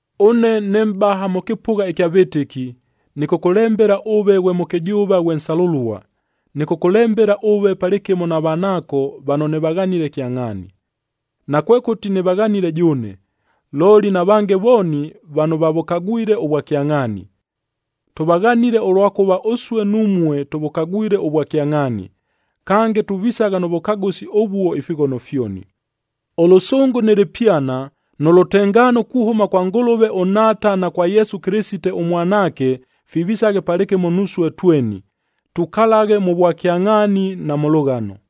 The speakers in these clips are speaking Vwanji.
Ʉne ne mʼbaha mʉ kɨpʉgha ɨkya vɨtɨki, nɨkʉkʉlembela ʉve ghwe mʉkɨjʉʉva ghwe nsalʉlua. Nɨkʉkʉlembela ʉve palɨkɨmo na vanaako vano nɨvaghanile kyangʼhaani.a Nakwekʉti nɨvaghanile jʉʉne, looli na vange vooni vano vavʉkagwile ʉvwakyangʼhaani. Tʉvaghanile, ʉlwakʉva ʉsue numue tʉvʉkagwile ʉvwakyangʼhaani, kange tuvisagha nʉ vʉkagʉsi ʉvuo ifighono fyoni. Ʉlʉsʉngʉ nɨ lɨpyana nʉ lʉtengaano kuhʉma kwa Ngʉlʉve ʉNhaata na kwa Yesu Kɨlɨsite ʉMwanaake fivisaghe palɨkɨmo nusue tweni, tukalaghe mʉ vwakyangʼhaani na mʉ lʉghano.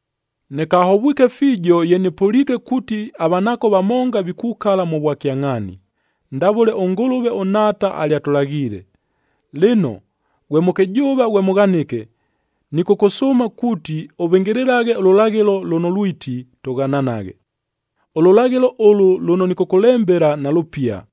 Nɨkahovwike fiijo ye nɨpʉliike kuuti avanaako vamonga vikukala mʉ vwakyangʼhaani, ndavʉle ʉNgʉlʉve ʉNhaata alyatʉlaghiile. Lɨno ghwe mʉkɨjʉʉva ghwe mʉghanɨke, nɨkʉkʉsʉʉma kuuti ʉvɨngɨlɨlaghe ʉlʉlaghɨlo lʉno lwiti, tʉghananaghe. Ʉlʉlaghɨlo ʉlʉ lʉno nɨkʉkʉlembela nalʉpia,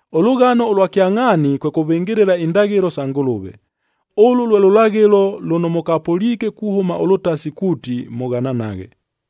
Ʉlʉghano ʉlwa kyangʼhaani kwe kʉvɨngɨlɨla indaghɨlo sa Ngʉlʉve. Ʉlʉ lwe lʉlaghɨlo lʉno mʉkapʉliike kuhʉma ʉlʉtasi kuuti, mʉghananaghe.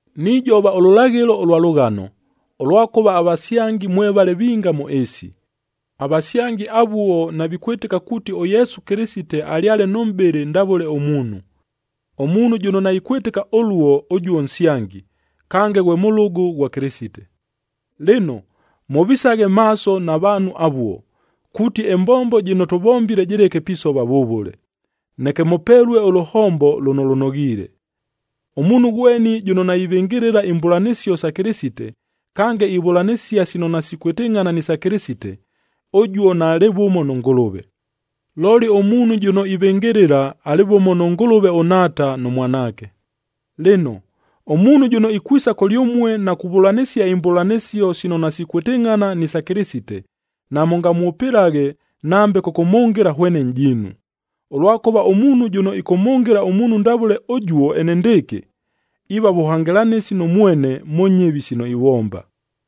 Nijova ʉlʉlaghɨlo ʉlwa lʉghano, ʉlwakʉva avasyangi mwevale vinga mʉ ɨɨsi. Avasyangi avuo navikwɨtɨka kuuti ʉYesu Kɨlɨsite alyale nʉ mʼbɨlɨ ndavʉle ʉmuunhu. Ʉmuunhu jʉno naikwɨtɨka ʉluo, ʉjuo nsyangi, kange ghwe mʉlʉgʉ ghwa Kɨlɨsite. Lɨno, mʉvisaghe maaso na vaanhu avuo, kuuti ɨmbombo jɨno tʉvombile jɨleke pisova vʉvʉle, neke mʉpelue ʉlʉhombo lʉno lʉnoghiile. Ʉmuunhu ghweni jʉno naivɨngɨlɨla imbʉlanɨsio sa Kɨlɨsite, kange ivʉlanɨsia sino nasikwɨtɨngʼhana ni sa Kɨlɨsite, ʉjuo naalɨ vʉmo nʉ Ngʉlʉve. Looli ʉmuunhu jʉno ivɨngɨlɨla, alɨ vʉmo nʉ Ngʉlʉve ʉNhaata nʉ Mwanaake. Lɨno, ʉmuunhu jʉno ikwisa kʉlyʉmue na kuvʉlanɨsia imbʉlanɨsio sino nasikwɨtɨngʼhana ni sa Kɨlɨsite, namʉngamwʉpɨlaghe nambe kʉkʉmhʉngɨla hwene nʼjiinu. Ʉlwakʉva ʉmuunhu jʉno ɨkʉmhʉngɨla ʉmuunhu ndavʉle ʉjuo enendɨɨkɨ, iiva vʉhangɨlanɨsi nʉ mwene mʉ nyɨvi sino ivomba.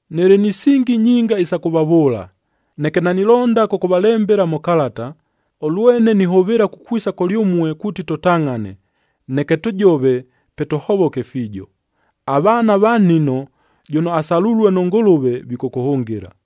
Nɨlɨ ni singi nyinga isa kʉvavʉʉla, neke nanilonda kʉkʉvalembela mʉ kalata, ʉlwene nihʉvɨɨla kukwisa kʉlyʉmue kuuti tʉtangʼhane, neke tʉjove, pe tʉhovoke fiijo. Avaana va nnino,c jʉno asalulue nʉ Ngʉlʉve, vikʉkʉhʉngɨla.